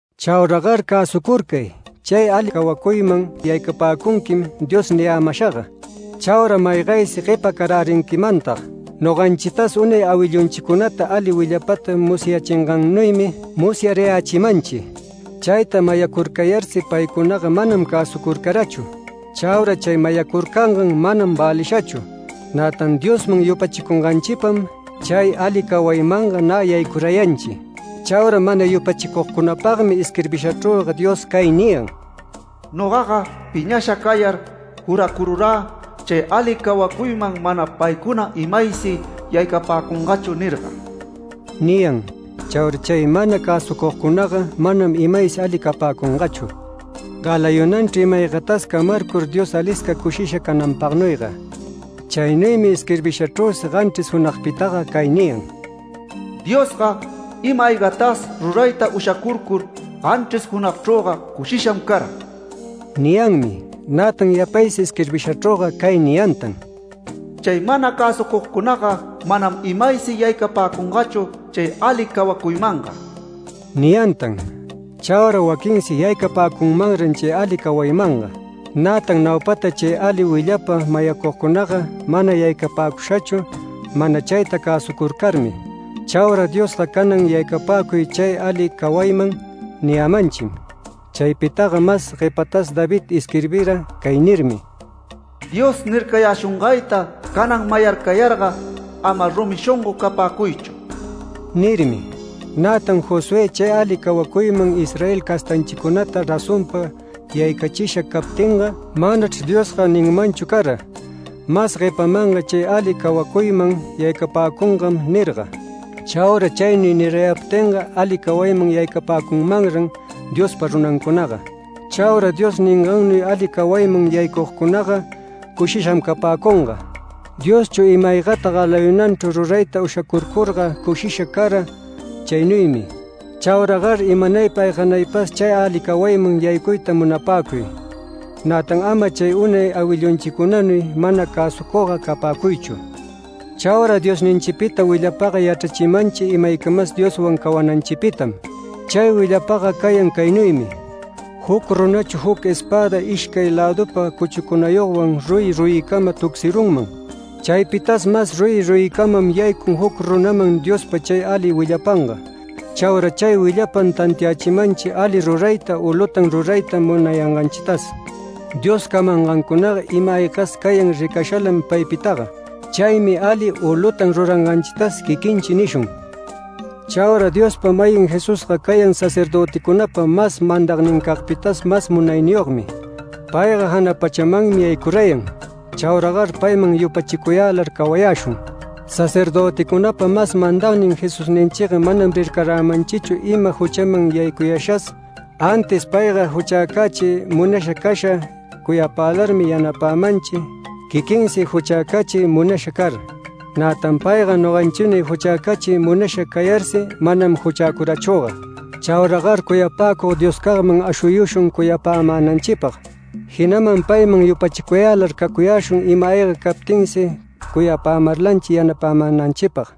Chauragar cäsucurcay “Chay ali cawacuyman yaycapäcunquim” Dios niyämashaga. Chaura maygaysi guepa carärinquimantag. Noganchitas unay awillunchicunata ali willapata musyachingannuymi musyarayächimanchi. Chayta mayacurarcayarsi paycunaga manam cäsucucarachu. Chaura chay mayacurcangan manam välishachu. Nätan Diosman yupachicunganchipam, chay ali cawaymanga nä yaycurayanchi. Chaura mana yupachicugcunapagmi isquirbishachrüga Dios cay niyan: “Nogaga piñasha cayar juracururä chay ali cawacuyman manam paycunaga imaysi yaycapäcungachu nirga” niyan. Chaura chay mana cäsucugcunaga manam imaysi aliga capäcungachu, galayunanchru ima-aygatas camarcur Dios alisca cushisha cananpagnuyga. Chaynuymi isquirbishachrüsi ganchris junagpitaga cay niyan: “Diosga ima-aygatas rurayta ushacurcur ganchris junagchrüga cushisham cara” niyanmi. Nätan yapaysi isquirbishachrüga cay niyantan: “Chay mana cäsucugcunaga manam imaysi yaycapäcungachu chay ali cawacuymanga” niyantan. Chaura waquinsi yaycapäcunmanran chay ali cawaymanga. Nätan naupata chay ali willapa mayacugcunaga mana yaycapäcushachu, mana chayta cäsucurcarmi. Chaura Diosga “Canan yaycapäcuy chay ali cawayman” niyämanchim. Chaypitaga mas guepatas David isquirbira cay nirmi: “Dios nircayäshungayta canan mayarcayarga, ama rumi shongo capäcuychu” nirmi. Nätan Josué chay ali cawacuyman Israel castanchicunata razonpa yaycachisha captinga, manachr Diosga ninmanchu cara: “Mas guepamanga chay ali cawacuyman yaycapäcungam” nirga. Chaura chaynuy nirayaptinga ali cawayman yaycapäcunmanran Diospa runancunaga. Chaura Dios ningannuy ali cawayman yaycugcunaga cushisham capäcunga. Dioschu ima-aygata galayunanchru rurayta ushacurcurga cushisha cara chaynuymi. Chauragar imanaypa ayganaypas chay ali cawayman yaycuyta munapäcuy, nätan ama chay unay awillunchicunanuy mana cäsucugga capäcuychu. Chaura Diosninchipita willapaga yachrachimanchi imaycamas Dioswan cawananchipitam. Chay willapaga cayan caynuymi: Juc runachu juc espäda ishcay lädüpa cuchucunayogwan ruyi ruyicama tucsirunman. Chaypitas mas ruyi ruyicamam yaycun juc runaman Diospa chay ali willapanga. Chaura chay willapam tantiachimanchi ali rurayta u lutan rurayta munayanganchitas. Dios camangancunaga ima-aygas cayan ricashalam paypitaga. Chaymi ali u lutan ruranganchitas quiquinchi nishun. Chaura Diospa-mayin Jesusga cayan sacerdöticunapa mas mandagnincagpitas mas munayniyogmi. Payga jana pachamanmi yaycurayan. Chauragar payman yupachicuyälar cawayäshun. Sacerdöticunapa mas mandagnin Jesusninchiga manam rircaramanchichu ima juchaman yaycuyashas, antis payga juchäcachiy munasha casha cuyapälarmi yanapämanchi quiquinsi juchäcachiy munasha car. Nätan payga noganchinuy juchäcachiy munasha cayarsi manam juchäcurachüga. Chauragar cuyapäcug Dioscagman ashuyushun cuyapämänanchipag, jinaman payman yupachicuyälar cacuyäshun ima-ayga captinsi cuyapämarlanchi yanapämänanchipag.